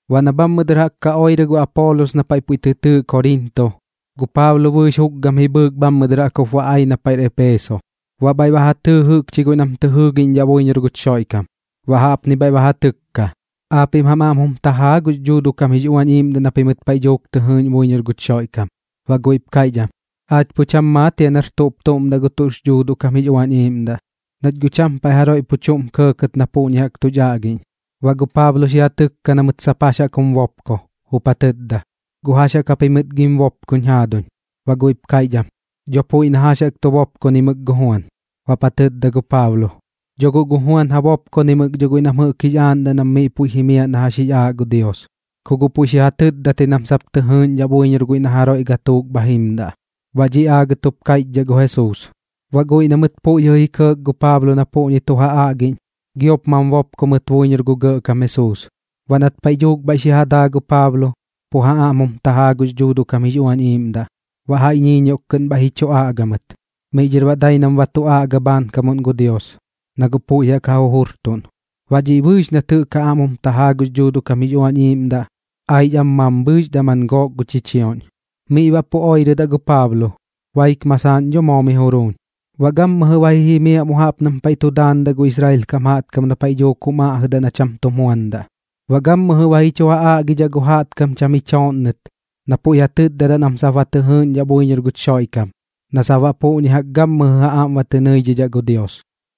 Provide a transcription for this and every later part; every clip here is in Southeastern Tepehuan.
Baꞌ na bhammɨ dɨr jaꞌk ka oirɨ gu Apoolos na paiꞌ puiꞌ tɨ tɨɨꞌ Koriinto, gu Paablo bɨɨx jukgam ji bhɨɨk bhammɨ dɨr jaꞌk jup ba ai na paiꞌr Eepeso. Baꞌ bhaiꞌ ba ja tɨɨ jɨꞌkchi guiꞌ nam tɨ jɨɨgiꞌñdhaꞌ buiñor guch Xoiꞌkam, baꞌ jaꞌpni bhaiꞌ ba ja tɨkka: ―¿Aapiꞌm jam aꞌm jum tajaa aa gux Dhuuduꞌ kam jix Uañ Iiꞌmdaꞌ na pimɨt paiꞌ dhuuk tɨ jɨɨꞌñ buiñor guch Xoiꞌkam? Baꞌ guiꞌp kaiꞌch am: ―Aach pu cham maat jia nar tuꞌp tuꞌm daꞌ gu tuꞌx Dhuuduꞌ kam jix Uañ Iiꞌmdaꞌ, nach guꞌ cham paiꞌ jaroiꞌ pu chuꞌm kɇɇkɇt na puꞌñi jaꞌk tuch aꞌgiꞌñ. Baꞌ gu Paablo xi ja tɨkka na mɨt sap jax jaꞌk jum bopko, jup ja tɨtda: ―¿Guꞌ jax jaꞌk japimɨt gim bopkoñ jaaduñ? Baꞌ guiꞌp kaiꞌch am: ―Dho puiꞌ na jax jaꞌk tu bopkonaimɨk gu Juan. Baꞌp ja tɨtda gu Paablo: ―Dho guꞌ gu Juan ja bopkonaimɨk dho guiꞌ nam jɨꞌk jix aaꞌndaꞌ nam miꞌ puiꞌ ba jiimdaꞌ na jax jix aaꞌ gu Dios, ku guꞌ puiꞌ xi ja tɨtdat ji nam sap tɨ jɨɨꞌñdhaꞌ buiñor guiꞌ na jaroiꞌ gatuuk bha jimdaꞌ, na dhiꞌ aagɨt jup kaiꞌchdhaꞌ gu Jesuus. Baꞌ guiꞌ na mɨt puiꞌ jɨꞌ ji kɇɇk gu Paablo na puꞌñi tu ja aꞌgiꞌñ, giop mam bopko mɨt buiñor gu Gɇꞌkam Jesuus. Baꞌ nat paiꞌ dhuuk bhaiꞌ xi ja daa gu Paablo, pu ja aꞌm jum tajaa gux Dhuuduꞌ kam jix Uañ Iiꞌmdaꞌ, baꞌ jaiꞌ ñiiñioꞌk kɨꞌn bhaiꞌ ji chu aꞌga mɨt. Miꞌ dhɨr baꞌ dai nam ba tu aꞌga bhaankamuꞌn gu Dios, na guꞌ puiꞌ jaꞌk ja jujurtuꞌn. Baꞌ dhiꞌ bɨɨx nat jɨꞌk ja aꞌm jum tajaa gux Dhuuduꞌ kam jix Uañ Iiꞌmdaꞌ, aix am mambhɨɨx daman gook gu chichioꞌñ. Miꞌ baꞌ pu oirɨdaꞌ gu Paablo, baik masaaꞌn dho moo miꞌ juruuñ. Baꞌ gammɨjɨ ba ji jimiaꞌ mu jaꞌp nam paiꞌ tu daandaꞌ gu Israel kam jaꞌtkam na paiꞌ dhuuk jum aꞌjɨdaꞌ na cham tum juandaꞌ, baꞌ gammɨjɨ ba ji chu ja aꞌgidhaꞌ gu jaꞌtkam cham ji chooꞌnnɨt na puiꞌ ja tɨtdadaꞌ nam sap ba tɨ jɨɨꞌñdhaꞌ buiñor guch Xoiꞌkam na sap baꞌ puꞌñi jaꞌk gammɨjɨ ja aꞌm ba tɨ nɨidhidhaꞌ gu Dios.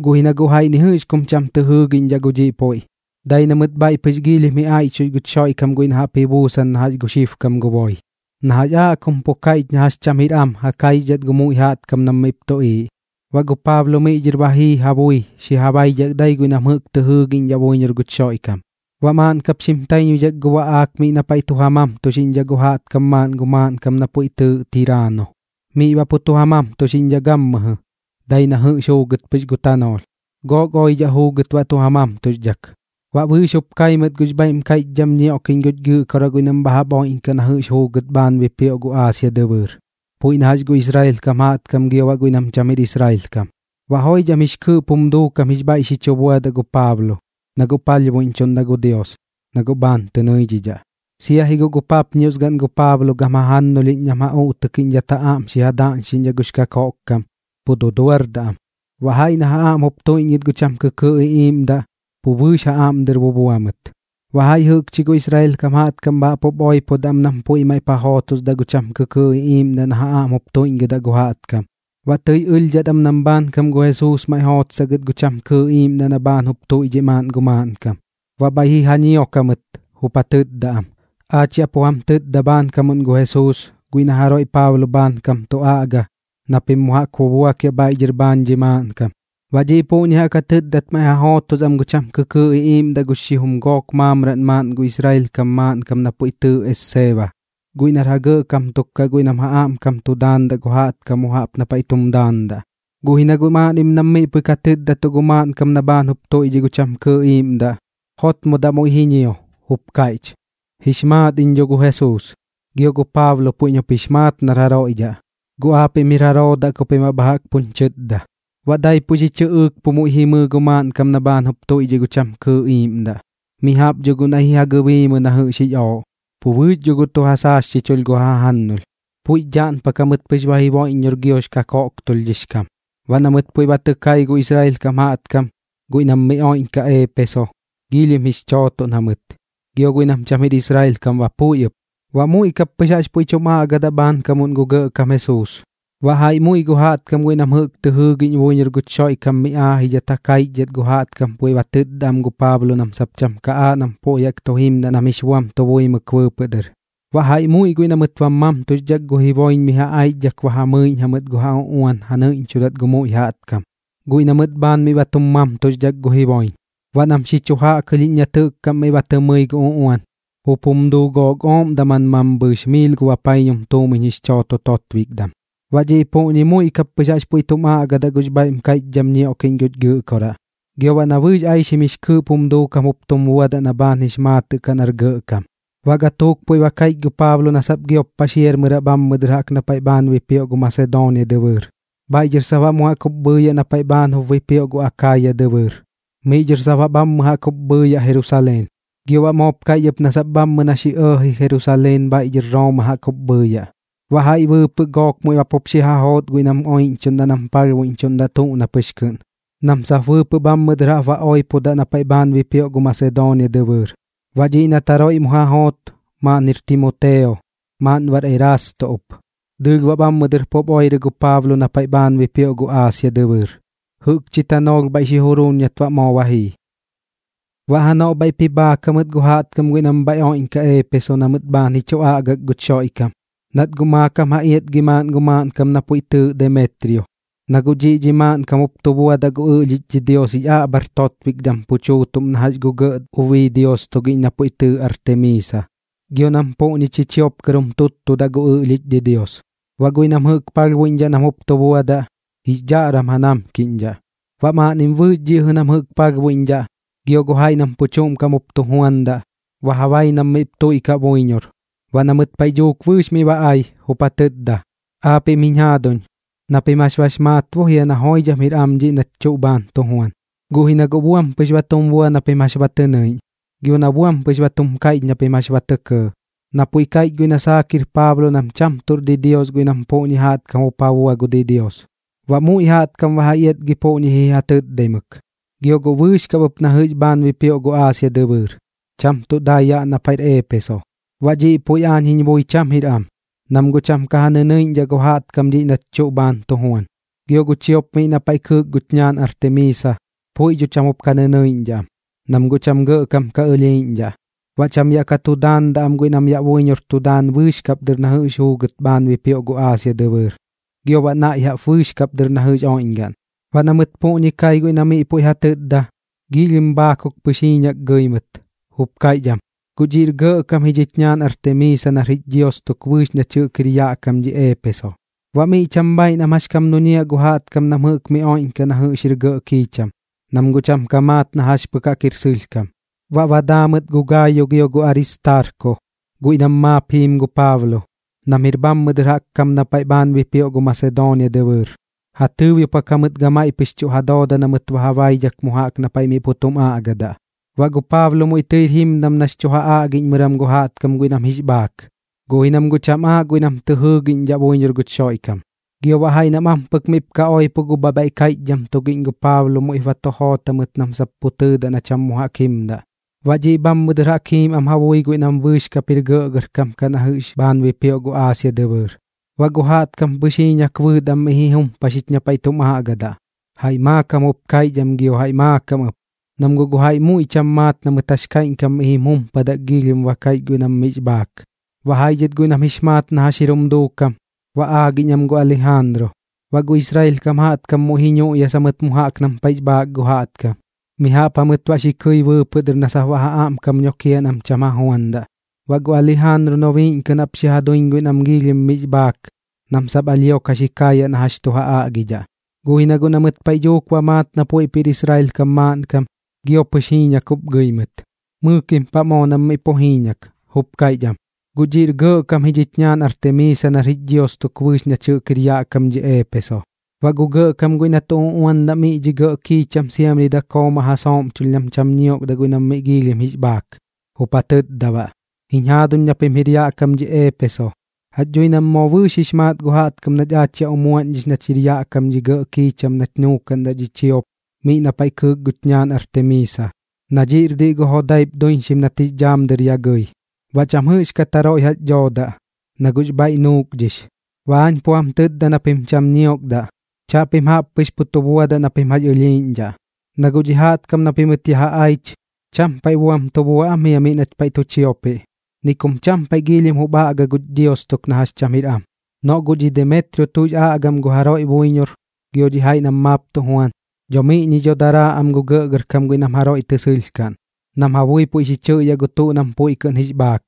Guꞌ ji na guꞌ jaiꞌ ni jɨꞌx kum cham tɨ jɨɨgiꞌñdhaꞌ gu dhiꞌ puiꞌ, dai na mɨt bhaiꞌ pɨx giilhim ji aiꞌchux guch Xoiꞌkam guiꞌ na jaꞌp ji buusan na jax gu xibkam gu boi, na jax aaꞌ kum pu kaiꞌch na jax cham jir am ja kaixdhat gu muiꞌ jaꞌtkam nam miꞌp tuꞌiiꞌ. Baꞌ gu Paablo miꞌ dhɨr ba jii ja bui xi ja baidhak dai guiꞌ nam jɨꞌk tɨ jɨɨgiꞌñdhaꞌ buiñor guch Xoiꞌkam. Baꞌ maaꞌn kap xim taiñbuidhak gu baꞌaak miꞌ na paiꞌ tu ja mamtuxiꞌñdhaꞌ gu jaꞌtkam maaꞌn gu maaꞌnkam na puiꞌ tɨɨꞌ Tiraano, miꞌ baꞌ pu tu ja mamtuxiꞌñdhaꞌ gammɨjɨ, dai na jɨꞌx juugɨt pɨx gu tanoolh. Gook oidhaꞌ juugɨt baꞌ tu ja mamtuxdhak, baꞌ bɨɨx jup kai mɨt gux bhaiꞌm kaiꞌchdham ñioꞌkiꞌñ guch Gɨꞌkoraꞌ guiꞌ nam bha jaꞌp oiꞌñkaꞌ na jɨꞌx juugɨt bhaan bipioꞌ gu Aasia dɨbɨɨr, puiꞌ na jax gu Israel kam jaꞌtkam gio guiꞌ nam cham jir Israel kam. Baꞌ joidham jix kɨɨꞌp jum duukam jix bhaiꞌ xi chu buadaꞌ gu Paablo, na guꞌ palhbuiꞌñdhaꞌ gu Dios, na guꞌ bhaan tɨ nɨidhidhaꞌ. Sia ji guꞌ gu papñios gaꞌn gu Paablo gam jajannulhiꞌñ nam ja uꞌtɨkiꞌñdhat ja aꞌm xi ja daꞌñxiꞌñ gux kakoꞌkkam, pu duduar am. Baꞌ jaiꞌ na ja aꞌm jup tuiꞌñgɨt gu cham kɨkɨɨꞌ iꞌiiꞌmdaꞌ, pu bɨɨx ja aꞌm dɨr bubua mɨt. Baꞌ jaiꞌ jɨꞌkchi gu Israel kam jaꞌtkam bha jaꞌp jup oipodaꞌ am nam puiꞌ maiꞌp ja jootosdaꞌ gu cham kɨkɨɨꞌ iꞌiiꞌmdaꞌ na ja aꞌm jup tuiꞌñgɨdaꞌ gu jaꞌtkam. Baꞌ tɨi ɨlhdhat am nam bhaankam gu Jesuus maiꞌ xi ja jootsaꞌ gɨt gu cham kɨkɨɨꞌ iꞌiiꞌmdaꞌ na bhaan jup tuiꞌdhiꞌ maaꞌn gu maaꞌnkam. Baꞌ bhaiꞌ ji ja ñiok jamɨt, jup ja tɨtda am: ―¡Aach yaꞌ pu jam tɨtda bhaankamuꞌn gu Jesuus, guiꞌ na jaroiꞌ Paablo bhaankam tu aꞌga, na pim mu jaꞌk bubuakiaꞌ bhaiꞌ dhɨr bhaan dhi maaꞌnkam! Baꞌ dhiꞌ puꞌñi jaꞌk ja tɨtdadat maiꞌ ja jootosdaꞌ am gu cham kɨkɨɨꞌ iꞌiiꞌmdaꞌ gu xijum gook maamraꞌn maaꞌn gu Israel kam maaꞌnkam na puiꞌ tɨɨꞌ Esseeba, guiꞌ nar ja gɇꞌkam tuk kaꞌ guiꞌ nam ja aꞌmkam tu daandaꞌ gu jaꞌtkam mu jaꞌp na paiꞌ tum daandaꞌ. Guꞌ ji na guꞌ maaꞌnnim nam miꞌ puiꞌ ka tɨtdatuꞌ gu maaꞌnkam na bhaan jup tuiꞌdhiꞌ gu cham kɨɨꞌ iiꞌmdaꞌ, jotmodaꞌ muiꞌ ji ñio, jup kaiꞌch: ―Jix maat iñ dho gu Jesuus, gio gu Paablo puiꞌñ jup jix maat nar jaroiꞌ dhaꞌ. ¿Guꞌ aapiꞌm jir jaroo daꞌ ku pim baꞌ bha jaꞌk puñ chɨtda? Baꞌ daipuꞌ xi chɨꞌɨɨk, pu muiꞌ jimɨɨ gu maaꞌnkam na bhaan jup tuiꞌdhiꞌ gu cham kɨɨꞌ iiꞌmdaꞌ. Mi jaꞌp dho guꞌ naiꞌ ji ja gɨbiimɨ na jɨꞌx jix ooꞌ, pu bɨɨx dho guꞌ tu ja saasxichulh gu ja jajannulh. Puiꞌx dhaꞌnpak jamɨt pɨx ba jiboiꞌññor giox kakoꞌktulhdhix kam. Baꞌ na mɨt puiꞌ ba tɨ kai gu Israel kam jaꞌtkam guiꞌ nam mi oiꞌñkaꞌ Eepeso, giilhim jix chootoꞌn jamɨt, gio guiꞌ nam cham jir Israel kam ba puiꞌ ɨp. Baꞌ muiꞌ kap pɨx jaꞌx puiꞌ tum aꞌgadaꞌ bhaankam gu Gɇꞌkam Jesuus. Baꞌ jaiꞌ muiꞌ gu jaꞌtkam guiꞌ na mɨt jɨꞌk tɨ jɨɨꞌñ buiñor guch Xoiꞌkam mi aajidhat ja kaichdhat gu jaꞌtkam puiꞌ ba tɨtdadaꞌ am gu Paablo nam sap cham ka aaꞌ nam puiꞌ jaꞌk tu jimdaꞌ nam jix buam tu buimɨk bɨɨpɨꞌ dɨr. Baꞌ jaiꞌ muiꞌ guiꞌ na mɨt bam mamtuxdhak gu jiboiñ mi ja aichdhak ba ja mɨiꞌñ jamɨt gu ja uꞌuan ja nɨiꞌñchudat gu muiꞌ jaꞌtkam, guiꞌ na mɨt bhaan miꞌ ba tum mamtuxdhak gu jiboiñ. Baꞌ nam xi chu jaꞌkɨlhiꞌñ nat jɨꞌk kaꞌm miꞌ ba tɨ mɨi gu uꞌuan, jup jum duu gook ooꞌm daman mambhɨɨx miil gu bapaiñum tuumiñ jix chooto totbikdam. Baꞌ dhiꞌ puꞌñi muiꞌ kap pɨx jaꞌx puiꞌ tum aꞌgadaꞌ gux bhaiꞌm kaiꞌchdham ñioꞌkiꞌñ guch Gɨꞌkoraꞌ, gio baꞌ na bɨɨx aixim jix kɨɨꞌp jum duukam jup tum buadaꞌ na baꞌ bhaan jix maatɨꞌ kaꞌ nar gɇꞌkam. Baꞌ gatuuk puiꞌ ba kaiꞌch gu Paablo na sap giop paxiarmɨraꞌ bhammɨ dɨr jaꞌp na paiꞌ bhaan bipioꞌ gu Masedoonia dɨbɨɨr, bhaiꞌ dhɨr sap baꞌ mu jaꞌk jup bhɨɨyaꞌ na paiꞌ bhaan jup bipioꞌ gu Akaaya dɨbɨɨr. Miꞌ dhɨr sap baꞌ bhammɨ jaꞌk jup bhɨɨyaꞌ Jerusaleen, gio baꞌ moop kaiꞌch ɨp na sap bhammɨ na xi ɇɇji Jerusaleen bhaiꞌ dhɨr Rooma jaꞌk jup bhɨɨyaꞌ. Baꞌ jaiꞌ bɨɨpɨꞌ gook muiꞌ ba pup xi ja joot guiꞌ nam oiꞌñchuꞌndaꞌ nam palhbuidhidhaꞌ tuꞌ na pɨx kɨꞌn, nam sap bɨɨpɨꞌ bhammɨ dɨr jaꞌp baꞌ oipodaꞌ na paiꞌ bhaan bipioꞌ gu Masedoonia dɨbɨɨr. Baꞌ dhiꞌ nat jaroiꞌ mu ja joot, maaꞌn jir Timoteo, maaꞌn baꞌr Erasto ɨp. Dɨɨlh baꞌ bhammɨ dɨr pup oirɨ gu Paablo na paiꞌ bhaan bipioꞌ gu Aasia dɨbɨɨr, jɨꞌkchi tanoolh bhaiꞌ xi juruuñ nat baꞌ moo ba jii. Baꞌ janoꞌ bhaiꞌp ji bhaak jamɨt gu jaꞌtkam guiꞌ nam bhaiꞌ oiꞌñkaꞌ Eepeso na mɨt bhaan ji chu aꞌgak guch Xoiꞌkam, nat guꞌ maakam ja iatgi maaꞌn gu maaꞌnkam na puiꞌ tɨɨꞌ Demetrio. Na guꞌ dhiꞌ dhi maaꞌnkam jup tu buadaꞌ gu ɨꞌlhich didios jix aꞌbhar totbikdam pu chuutuꞌm na jax gu gɇꞌ ubii dios tugiꞌñ na puiꞌ tɨɨꞌ Artemiisa, gio nam puꞌñi chichiop kɨr jup tuuttudaꞌ gu ɨꞌlhich didios. Baꞌ guiꞌ nam jɨꞌk palhbuiꞌñdhaꞌ nam jup tu buadaꞌ, jix dhaꞌram ja namkiꞌñdhaꞌ. Baꞌ maaꞌnnim bɨɨx dhiꞌ jɨꞌ nam jɨꞌk palhbuiꞌñdhaꞌ, gio gu jaiꞌ nam pu chuꞌm kaꞌm jup tu juandaꞌ, ba ja bai nam miꞌp tuiꞌkaꞌ buiñor. Baꞌ na mɨt paiꞌ dhuuk bɨɨx miꞌ ba ai, jup ja tɨtda: ―Aapiꞌm jiñ jaaduñ, na pim jax bax maat bo jia na joidham jir am dhiꞌ nach tuꞌ bhaan tu juan. Guꞌ ji na guꞌ buam pɨx ba tum bua na pim jax ba tɨ nɨiꞌñ, gio na buam pɨx ba tum kaiꞌch na pim jax ba tɇ kɇɇ, na puiꞌ kaiꞌch guiꞌ na saak jir Paablo nam sap cham tuꞌr didios guiꞌ nam puꞌñi jaꞌtkam jup ja bua gu didios. Baꞌ muiꞌ jaꞌtkam ba ja iatgi puꞌñi ji ja tɨtdaimɨk, gio guꞌ bɨɨx kap ɨp na jɨꞌx bhaan bipioꞌ gu Aasia dɨbɨɨr, cham tuꞌ dai yaꞌ na paiꞌr Eepeso. Baꞌ dhiꞌ puiꞌ aañ jiñ bui cham jir am, nam guꞌ cham ka ja nɨnɨiꞌñdhaꞌ gu jaꞌtkam dhiꞌ nach tuꞌ bhaan tu juan, gio gu chiop miꞌ na paiꞌ kɨɨk guch ñaan Artemiisa, puiꞌ dho cham jup ka nɨnɨiꞌñdhaꞌ am, nam guꞌ cham gɇꞌkam ka ɨlhiiꞌñdhaꞌ. Baꞌ cham yaꞌ ka tu daandaꞌ am guiꞌ nam yaꞌ buiñor tu daan bɨɨx kap dɨr na jɨꞌx juugɨt bhaan bipioꞌ gu Aasia dɨbɨɨr, gio baꞌ naiꞌ jaꞌp bɨɨx kap dɨr na jɨꞌx jir oiꞌñgaꞌn. Baꞌ na mɨt puꞌñi kai guiꞌ na miꞌ puiꞌ ja tɨtda, giilhim bhaakuk pɨx jiiñak gɨi mɨt, jup kaiꞌch am: ―¡Guꞌ dhiꞌr gɇꞌkam ji dhich ñaan Artemiisa nar jich dios tuk bɨɨx nach jɨꞌk jir yaꞌ kam dhi Eepeso! Baꞌ miꞌ cham bhaiꞌ nam jax kam duñiaꞌ gu jaꞌtkam nam jɨꞌk mi oiꞌñkaꞌ na jɨꞌx jir gɇꞌ kiicham, nam guꞌ cham ka maat na jax pɨk jaꞌk jir sɨlhkam. Baꞌ ba daa mɨt gu Gaayo gio gu Aristaarko, guiꞌ nam maap jiim gu Paablo, nam jir bhammɨ dɨr jaꞌk kam na bhaan bipioꞌ gu Masedoonia dɨbɨɨr. Ja tɨɨbiopak jamɨt gamaiꞌ pɨx tuꞌ ja dooda na mɨt ba ja baidhak mu jaꞌk na paiꞌ miꞌ pu tum aꞌgadaꞌ. Baꞌ gu Paablo muiꞌ tɨir jimdam nax chu ja aꞌgiꞌñmɨram gu jaꞌtkam guiꞌ nam jix bhaak, guꞌ ji nam guꞌ cham aaꞌ guiꞌ nam tɨ jɨɨgiꞌñdhaꞌ buiñor guch Xoiꞌkam. Gio baꞌ jaiꞌ nam ampɨk miꞌp ka oipo gu bhabhaiꞌ kaiꞌchdham tugiꞌñ gu Paablo muiꞌp ba tu joot jamɨt nam sap pu tɨɨdaꞌ na cham mu jaꞌk jimdaꞌ. Baꞌ dhiꞌ bhammɨ dɨr jaꞌk jiim am ja bui guiꞌ nam bɨɨx kap jir gɇꞌgɇrkam kaꞌ na jɨꞌx bhaan bipioꞌ gu Aasia dɨbɨɨr. Baꞌ gu jaꞌtkam pɨx jiiñak bɨɨt am miꞌ ji jumpaxich na paiꞌ tum aꞌgadaꞌ. Jaiꞌ maakam jup kaiꞌch am gio jaiꞌ maakam ɨp, nam guꞌ jaiꞌ muiꞌ cham maat na mɨt jax kaiꞌñkam miꞌ jim jumpadak giilhim ba kaiꞌch guiꞌ nam miꞌx bhaak. Baꞌ jaiꞌ dhɨt guiꞌ nam jix maat na jax jir jum duukam, ba aagiꞌñ am gu Alijaanru. Baꞌ gu Israel kam jaꞌtkam muiꞌ ji ñuꞌyasa mɨt mu jaꞌk nam paiꞌx bhaak gu jaꞌtkam, mi jaꞌp jamɨt baꞌ xi kɨi bɨɨpɨꞌ dɨr jaꞌk na sap ja aꞌmkam nokiaꞌ nam cham ja juandaꞌ. Baꞌ gu Alijaanru nobiiꞌñ kɨꞌn jaꞌp xi ja duiñ guiꞌ nam miꞌ giilhim jix bhaak nam sap alhio ka xi kaayaꞌ na jax tu ja aꞌgidhaꞌ. Guꞌ ji na guꞌ na mɨt paiꞌ dhuuk ba maat na puiꞌp jir Israel kam maaꞌnkam, gio pɨx jiiñak jup gɨi mɨt. Mɨɨkim paꞌ moo nam miꞌ pu jiiñak, jup kaiꞌch am: ―¡Guꞌ dhiꞌr gɇꞌkam ji dhich ñaan Artemiisa nar jich dios tuk bɨɨx nach jɨꞌk jir yaꞌ kam dhi Eepeso! Baꞌ gu gɇꞌkam guiꞌ na tu uꞌuandaꞌ gu miꞌ dhi gɇꞌ kiicham siamri dakoo ma ja sooꞌmchulh nam cham ñiokdaꞌ guiꞌ nam miꞌ giilhim jix bhaak, jup ja tɨtda baꞌ: ―Jiñ jaaduñ na pim jir yaꞌ kam dhi Eepeso, jax dhui nam moo bɨɨx jix maat gu jaꞌtkam nach aach yaꞌ umuaꞌñdhix nach jɨꞌk jir yaꞌ kam dhi gɇꞌ kiicham nach nuukaꞌndaꞌ dhi chiop miꞌ na paiꞌ kɨɨk guch ñaan Artemiisa, na dhiꞌr diꞌ gu jodaip duiñxim nat jix dhaam dɨr ya gɨi. Baꞌ cham jɨꞌxkat jaroiꞌ jax dhoodaꞌ, na guꞌx bhaiꞌ nuukdhix. Baꞌ aañ pu jam tɨtda na pim cham ñiokdaꞌ, chaꞌpim jaꞌp pɨx pu tu buadaꞌ na pim jax ɨlhiiꞌñdhaꞌ. Na guꞌ dhi jaꞌtkam na pimɨt yaꞌ ja aich, cham paiꞌ buam tu bua am jia miꞌ nach paiꞌ tu chiopiꞌ, ni kum cham paiꞌ giilhim jup aꞌga guch dios tuk na jax cham jir am. Noꞌ guꞌ dhi Demetrio tuꞌx aꞌgam gu jaroiꞌ buiñor gio dhi jaiꞌ nam maap tu juan, dho miꞌñi dho daraa am gu gɇꞌgɇrkam guiꞌ nam jaroiꞌ tɨ sɨlhkaꞌn, nam ja bui puiꞌ xi chɨꞌyaꞌ gu tuꞌ nam puiꞌ kɨꞌn jix bhaak,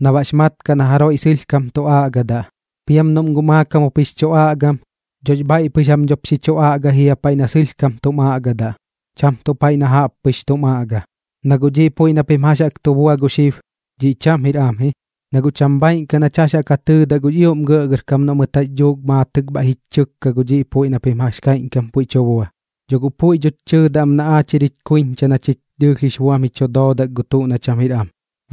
na baꞌx maatɨꞌ kaꞌ na jaroiꞌ sɨlhkam tu aꞌgadaꞌ. Piam noꞌm guꞌ maakam jup jix chu aꞌgam, dhox bhaiꞌ pɨx jam dhop xi chu aꞌgai jia paiꞌ na sɨlhkam tuꞌm aꞌgadaꞌ, cham tuꞌ paiꞌ na jaꞌp pɨx tum aꞌga. Na guꞌ dhiꞌ puiꞌ na pim jax jaꞌk tu bua gu xib, dhiꞌ cham jir am ji, na guꞌ cham bhaaiꞌn kaꞌ nach jax ja tɨɨdaꞌ gux ioꞌm gɇꞌgɇrkam noꞌ mɨt jax dhuuk maatɨk bhaiꞌ jich chɨkka gu dhiꞌ puiꞌ na pim jax kaiꞌñkam puiꞌ tu bua. Dho guꞌ puiꞌ dhoch chɨɨdaꞌ am na aach jir jich kuiñcha kaꞌ na chich dɨɨlh jix buam ji chu doodak gu tuꞌ na cham jir am.